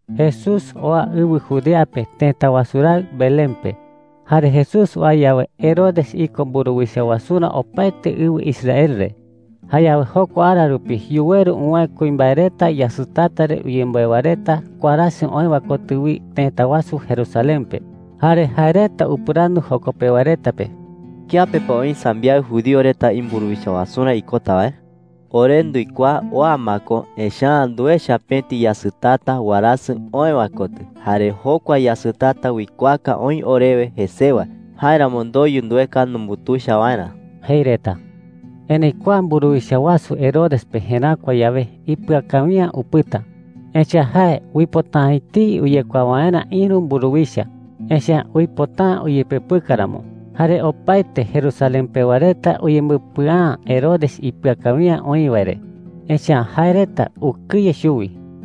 Jesús oa ɨwɨ Judea pe tëta wasu raɨ Belén pe. Jare Jesús oa yawe, Herodes iko mburuwicha wasurä opaete ɨwɨ Israel re. Jayawe jokua ara rupi yuweru uwäe kuimbae reta yasɨtata re uyemboe wae reta warasɨ oë wae kotɨ wi tëta wasu Jerusalén pe. Jare jae reta upɨrandu joko pewa reta pe: “¿Kiape pa oï sambiaɨ judío reta imburuwicha wasurä ikota wae?” jei reta. “Ore nduikuaa oa ma ko, echa’ä nduecha pëti yasɨtata warasɨ oë wae kotɨ. Jare jokua yasɨtata uikuaaka oï orewe jesewa. Jáeramo ndoyu ndueka numbutuicha waerä,” jei reta. Erëi kua mburuwicha wasu Herodes pe jeräkua yawe, ipɨa kawi’ä upɨta. Echa’ä jae uipota’ä etei uyekuaa waerä ïru mburuwicha, echa’ä uipota’ä uyepepɨka ramo. Jare opaete Jerusalén pewa reta uyembɨpɨa’ä Herodes ipɨa kawi’ä oï wae re, echa’ä jae reta ukɨye chuwi.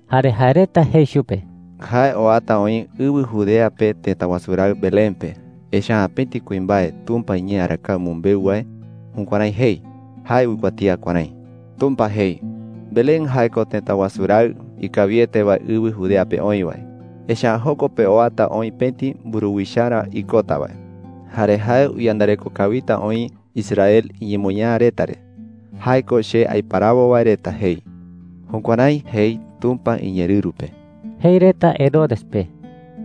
Jare jae reta jei chupe: “Jae oata oï ɨwɨ Judea pe tëta wasu raɨ Belén pe. Echa’ä pëti kuimbae Tumpa iñee arakae umɨmbeu wae jukuärái jei. Jae uikuatía kuärái: “Tumpa jei: ‘Belén jae ko tëta wasu raɨ ikawiete wae ɨwɨ Judea pe oï wae. Echa’ä joko pe oata oï pëti mburuwicharä ikota wae. Jare jae uyandareko kawita oï Israel iñemoñaa reta re – jae ko che aiparawo wae reta,’ jei.” Jukuärái jei Tumpa iñeerɨru pe,” jei reta Herodes pe.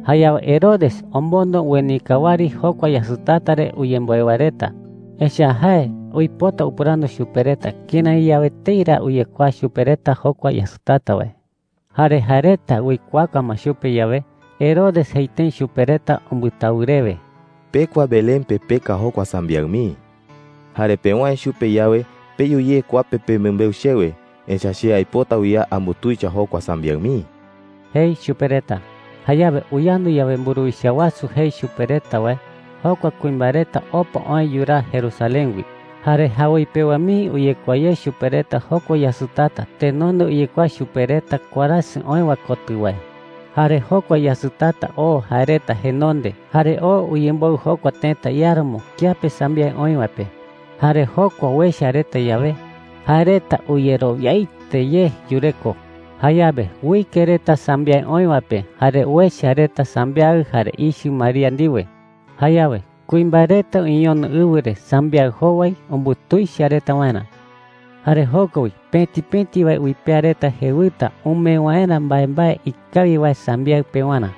Jayawe Herodes omondo uenika wɨari jokua yasɨtata re uyemboe wae reta. Echa’ä jae uipota upɨrandu chupe reta kërái yawe etei ra uyekuaa chupe reta jokua yasɨtata wae. Jare jae reta uikuaaka ma chupe yawe, Herodes jei tëi chupe reta umbɨtawɨ rewe: “Pekua Belén pe peka jokua sambiaɨ mii,” jei chupe reta. “Jare pewäe chupe yawe, peyu ye kua pe pemɨmbeu chewe. Echa’ä che aipota wi a ambutuicha jokua sambiaɨ mii,” jei chupe reta. Jayawe uyandu yawe mburuwicha wasu jei chupe reta wae, jokua kuimbae reta opa oë yuraa Jerusalén wi. Jare jawoi pewa mii uyekuaa ye chupe reta jokua yasɨtata tenonde uyekuaa chupe reta warasɨ oë wae kotɨ wae. Jare jokua yasɨtata oo jae reta jenonde jare oo uyemboɨ jokua tëta iáramo kiape sambiaɨ oï wae pe. Jare jokua uecha reta yawe, jae reta uyerowiaete ye yureko. Jayawe uike reta sambiaɨ oï wae pe jare uecha reta sambiaɨ jare ichɨ María ndiwe. Jayawe kuimbae reta uñeñono ɨwɨ re sambiaɨ jowai umbutuicha reta waerä. Jare joko wi pëti pëti wae uipea reta jewɨta umee waerä mbaembae ikawi wae sambiaɨ pewarä.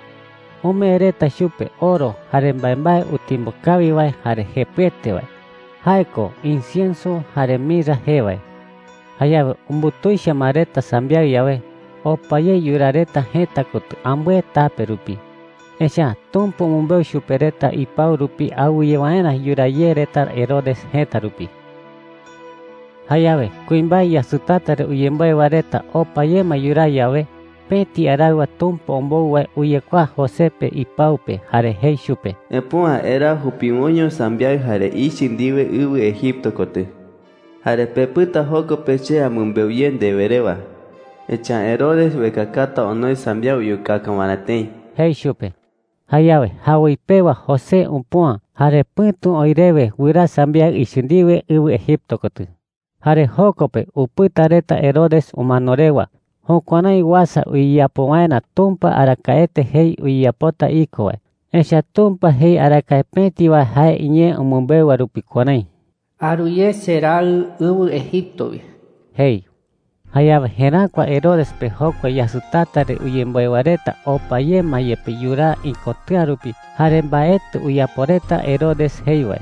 Umee reta chupe oro jare mbaembae utimbo kawi wae jare jepɨete wae – jae ko incienso jare mirra jee wae. Jayawe umbutuicha ma reta sambiaɨ yawe, opa ye yuraa reta jëta kotɨ ambɨe tape rupi. Echa’ä Tumpa umɨmbeu chupe reta ipau rupi awɨye waerä yuraa ye reta Herodes jëta rupi. Jayawe kuimbae yasɨtata re uyemboe wae reta opa ye ma yuraa yawe, pëti araɨwa Tumpa ombou wae uyekuaa José pe ipau pe jare jei chupe: “Epüa. Eraa jupiwoiño sambiaɨ jare ichɨ ndiwe ɨwɨ Egipto kotɨ. Jare pepɨta joko pe che amɨmbeu ye ndewe rewa. Echa’ä Herodes uekakata onoi sambiaɨ uyukaka waerä tëi,” jei chupe. Jayawe jawoi pewa José upüa, jare pɨ̈tu oï rewe wɨraa sambiaɨ ichɨ ndiwe ɨwɨ Egipto kotɨ. Jare joko pe upɨta reta Herodes umano rewa. Jukuärái uasa uyeyapo waerä Tumpa arakaete jei uyeyapota iko wae. Echa’ä Tumpa jei arakae pëti wae jae iñee umɨmbeu wae rupi kuärái: “Aru ye cheRaɨ ɨwɨ Egipto wi,” jei. Jayawe jeräkua Herodes pe jokua yasɨtata re uyemboe wae reta opa ye ma yepe yuraa ikotɨ̈a rupi jare mbaetɨ uyapo reta Herodes jei wae.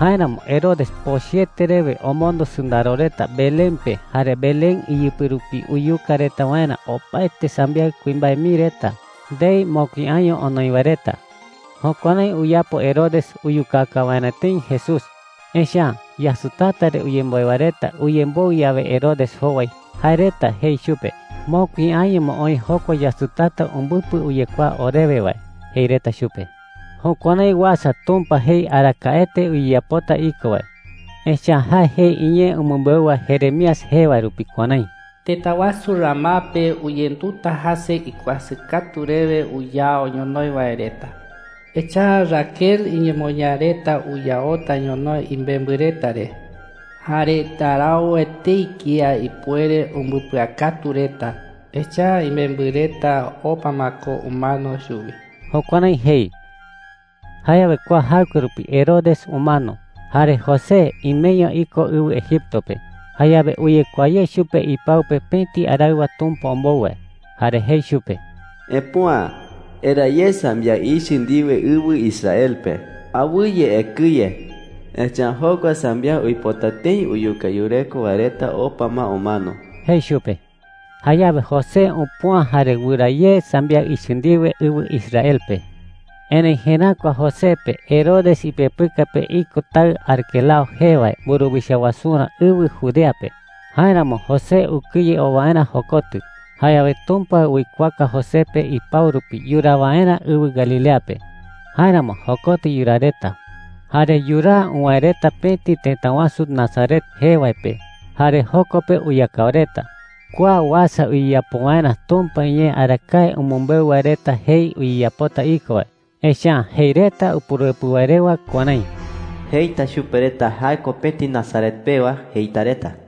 Jáeramo Herodes pochɨete rewe omondo sɨndaro reta Belén pe jare Belén iyɨpɨ rupi uyuka reta waerä opaete sambiaɨ kuimbae mii reta ndei mokui año onoi wae reta. Jukuärái uyapo Herodes uyukaka waerä tëi Jesús. Echa’ä yasɨtata re uyemboe wae reta uyemboɨ yawe Herodes jowai, jae reta jei chupe: “Mokui año ma oï jokua yasɨtata umbɨpɨ uyekuaa orewe wae,” jei reta chupe. Jukuärái uasa Tumpa jei arakaete uyeyapota iko wae. Echa’ä jae jei iñee umɨmbeu wae Jeremías jee wae rupi kuärái: “Tëta wasu Ramá pe uyenduta jäse ikuasɨ katu rewe uyao ñonoï wae reta. Echa’ä Raquel iñemoñaa reta uyaota ñonoï imembɨ reta re. Jare ndarau etei kía ipuere umbɨpɨakatu reta, echa’ä imembɨ reta opa ma ko umano chuwi.” Jukuärái jei. Jayawe kua jaɨkue rupi Herodes umano. Jare José imeño iko ɨwɨ Egipto pe. Jayawe uyekuaa ye chupe ipau pe pëti araɨwa Tumpa ombou wae. Jare jei chupe: “Epüa. Eraa ye sambiaɨ ichɨ ndiwe ɨwɨ Israel pe. Awɨye ekɨye, echa’ä jokua sambiaɨ uipota tëi uyuka yureko wae reta opa ma umano,” jei chupe. Jayawe José upüa jare wɨraa ye sambiaɨ ichɨ ndiwe ɨwɨ Israel pe. Erëi jeräkua José pe Herodes ipepɨka pe iko taɨ Arquelao jee wae mburuwicha wasurä ɨwɨ Judea pe. Jáeramo José ukɨye oo waerä jokotɨ. Jayawe Tumpa uikuaaka José pe ipau rupi yuraa waerä ɨwɨ Galilea pe. Jáeramo jokotɨ yuraa reta. Jare yuraa uwäe reta pëti tëta wasu Nazaret jee wae pe jare joko pe uyakao reta. Kua uasa uyeyapo waerä Tumpa iñee arakae umɨmbeu wae reta jei uyeyapota iko wae. Echa’ä jei reta Upuruepɨ wae rewa kuärái: “Jeita chupe reta: ‘Jae ko pëti Nazaret pewa,’ jeita reta.”